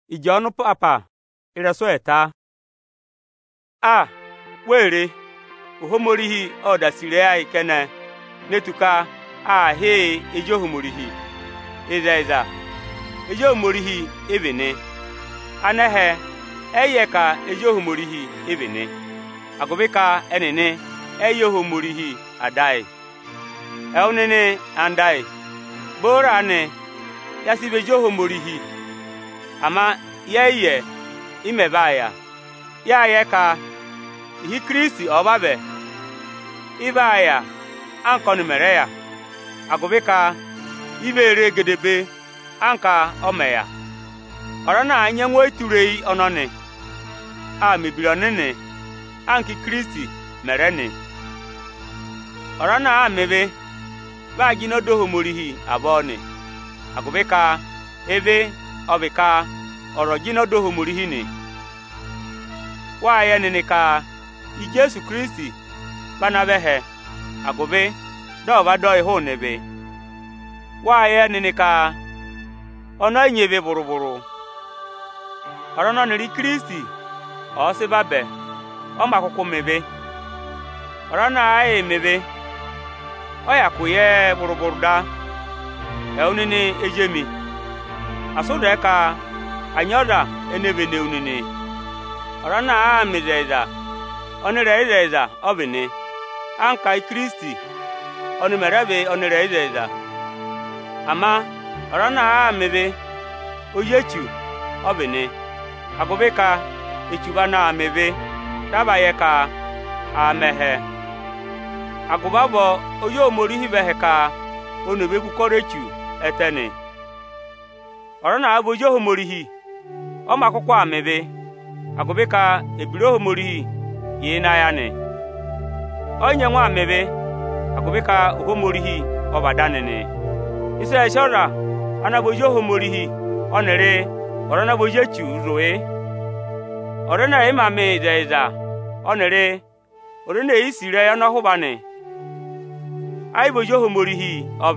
Ẹnẹ vị ezi Ohomorihi? A! Wee re! Ohomorihi ộ da sì ịrẹyị ayị kẹnẹ ne tù ka aa hị́ yị ezi Anị. Ịzẹyịza ezi Ohomorihi ị vị nị. Anẹhẹ ẹ́ yị yẹ ka ezi Ohomorihi ị vị nị, agụvị ka ẹnịnị ẹ́ yị yẹ Ohomorihi Ada ayị. Ẹwụ nịnị ẹyịnyara amị oni mi sì, booro aanị ya sị vị ezi Ohomorihi; ama yẹẹ̀ yị yẹ ị mẹ vaa yà. Yáa yẹ ka ịhị Ikirisiti ọ̀ọ vavẹ, ị vaa yà anka ọnị mẹ rẹ yà, agụvị ka i vee re gedebee anka ọ mẹ yà. Avaba aza ana nyị ẹngụ ọyịtureyi ọnọnị, aa mẹ̀ ebira ọnịnị anka Ikirisiti mẹ̀ rẹ nị nị. Ọza ana àaā mẹ ịvị, vị aa jịnẹ ọda Ohomorihi avọọ nị; agụvị ka ịvị ọ vị ka ọza ọ̀ jịnẹ ọda Ohomorihi nị. Wáa yẹ nịnị ka Ijeesu Ikirisiti vị ana vẹ ẹhẹ, agụvị dị ọ̀ va dị yị hụụnị ịvị. Wáa yẹ nịnị ka ọnị ẹ yị nyị ịvị vụrụ-vụrụ. Ọza ọnị ọnịrị Ikirisiti ọ̀ọ sị vabẹ, ọ yị mā kụkụ mẹ ịvị. Ọza ana àaā yịị mẹ ịvị, ọ̀ yị hyakụ yẹ ẹ vụrụ-vụrụ. Ẹwụ nịnị ezi emi, asị ụ zẹẹ ka à nyị ọza ene vene wu nịnị! Ọza ana àaā mẹ ịzẹyịza, ọnịrẹyịzẹyịza ọ vị nị, anka Ikirisiti ọnị mẹ̀ rẹ vị ọnịrẹyịzẹyịza. Ama ọza ana àa mẹ ịvị, ozi Echu ọ vị nị, agụvị ka Echu vị anaā mẹ ịvị dị a va yẹ ka aa mẹ ẹhẹ. Agụvị avọọ Ozi Ohomorihi vẹ ẹhẹ ka oni ò ve vú ụkọrọ Echu ẹtẹ nị. Ọza àa vị ozi Ohomorihi, ọ yị mā kụkụ mẹ ịvị, agụvị ka ebira Ohomorihi yà ịnị ayị anị. Ẹ yị nyẹngụ aa mẹ ịvị agụvị ka Ohomorihi ọ vị Ada anị nị. Ịsị ẹẹ̄ sị ọza ana vị ozi Ohomorihi ọnịrị ọza ana vị ozi Echuu zụ̀ yị: Ọza ẹnẹ ẹ̀ yị mẹ ịzẹyịza ọnịrị ọza ene è yi sì ịrẹyị ọnọhụva anị ẹ́ yị vị ozi Ohomorihi.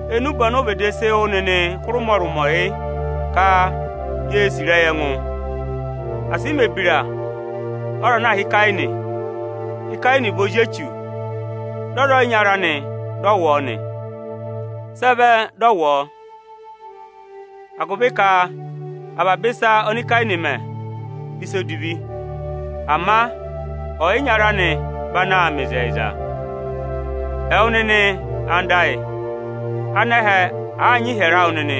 Enube ọnị ụ vịdị sị wụ́ nịnị hụrị ụmọrụmọ yị: ka ye sì ịrẹyị ẹngụ. Asị ị mẹ̀ ebira anka ọza ana aā hị́ Ikeeni. Ikeeni vị ozi Echu, dị ọ za ọyịnyara anị dị ọ wụ̀ ọ nị. Sị ẹ vẹ dị ọ wụ̀ ọ? Agụvị ka avaba ịsa ọnị Ikeeni aa mẹ, vị ịsa edivi; ama ọyịnyara anị vị anaā mẹ ịzẹyịza. Ẹwụ nịnị anda ayị, anẹhẹ àaa nyị ịhyẹrẹ awụ nịnị,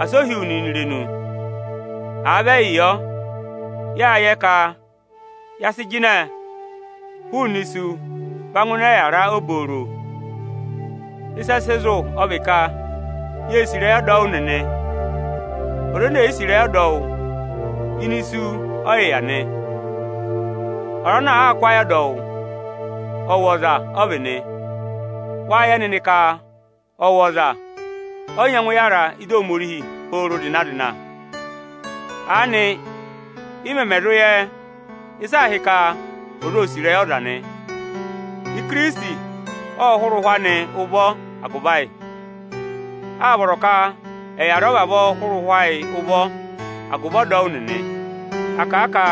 asị o hí wu nịnị irenu! Àa vị ẹyị yọ, yáa yẹ ka ya sị jịnẹ hụụnị isu va ngụ ịnị ọyịyara obooro. Ịsị ẹ sị zụ̀ ọ vị ka yée sì ịrẹyị ọdọwụ nịnị. Ọza ene è yi sì ịrẹyị ọdọwụ, ẹẹ̀ yị há hụrị isu ụvọ. Ọza ana àa kụ ayị ọdọwụ, ọwọza ọ vị nị. Wáa yẹ nịnị ka ọwọza ẹ́ yị zụ yara ịdị Ohomorihi pooro zịna-zịna. Aanị ị mẹmẹ zụ yẹ ịsị aā hị́ ka ọza óo sì ịrẹyị ọza nị: Ikirisiti ọ́ọ hụrẹ ụhwẹ anị ụvọ agụvị ayị. Áa vọrọ ka ẹ yà rẹ hụrẹ ụhwẹ ayịị ụvọ agụvị ọdọwụ nịnị. À kà a ka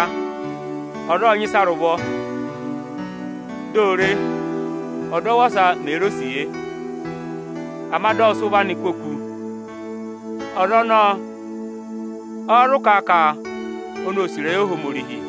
ọza ọ́ọ nyị ịsa rị ụvọ, dị o re ọdọwụ ọsa mee re osiye, ama dị ọ sị ụvọ anị kwoku yọ nị, ọza ọnọọ ọ́ọ́ zụ kà a ka oni o sì ịrẹyị Ohomorihi?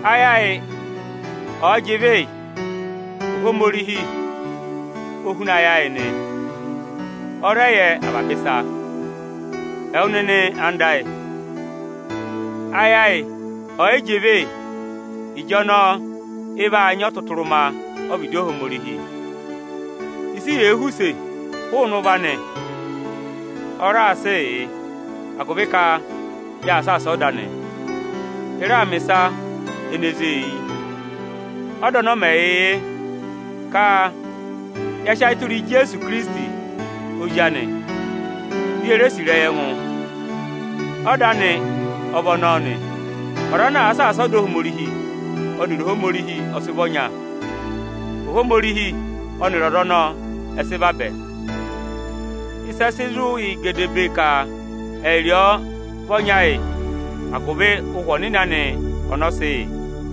Ayị ayị ọ̀ọ yị jị ịvị yị, Ohomorihi o huna ayị ayị nị, ọ́ọ rẹ yẹ avaba ịsa. Ẹwụ nịnị anda ayị, ayị ayị ọ̀ọ yị jị ịvị yị, ịjọnọọ ị vaa nyị ọtụtụrụma ọ́vịdị Ohomorihi. Ịsị yèe họ̀ use hụụnị ụvọ anị, ọ raa sịị yị, agụvị ka yaa saasa ọda anị; ị raa mẹ̀ ịsa ene zée eyi. Ọda ọnị ọ́ mẹ yị yị: ka ya sị ayị tụra Ijeesu Ikirisiti Ozi anị, di ye re sì ịrẹyị ẹngụ. Ọda anị ọ vị ọnọọ nị. Ọza ana àa saasa ọda Ohomorihi, ọnịrị Ohomorihi ọ sị vị ọnya, Ohomorihi ọnịrị ọza ọnọọ ọ sị vabẹ. Ịsị ẹ sị zụ̀ yị gedebee ka ẹyịrị ọ vị ọnya yị: agụvị Ụhwẹ Ọnịnị anị ọnị ọ sị yị.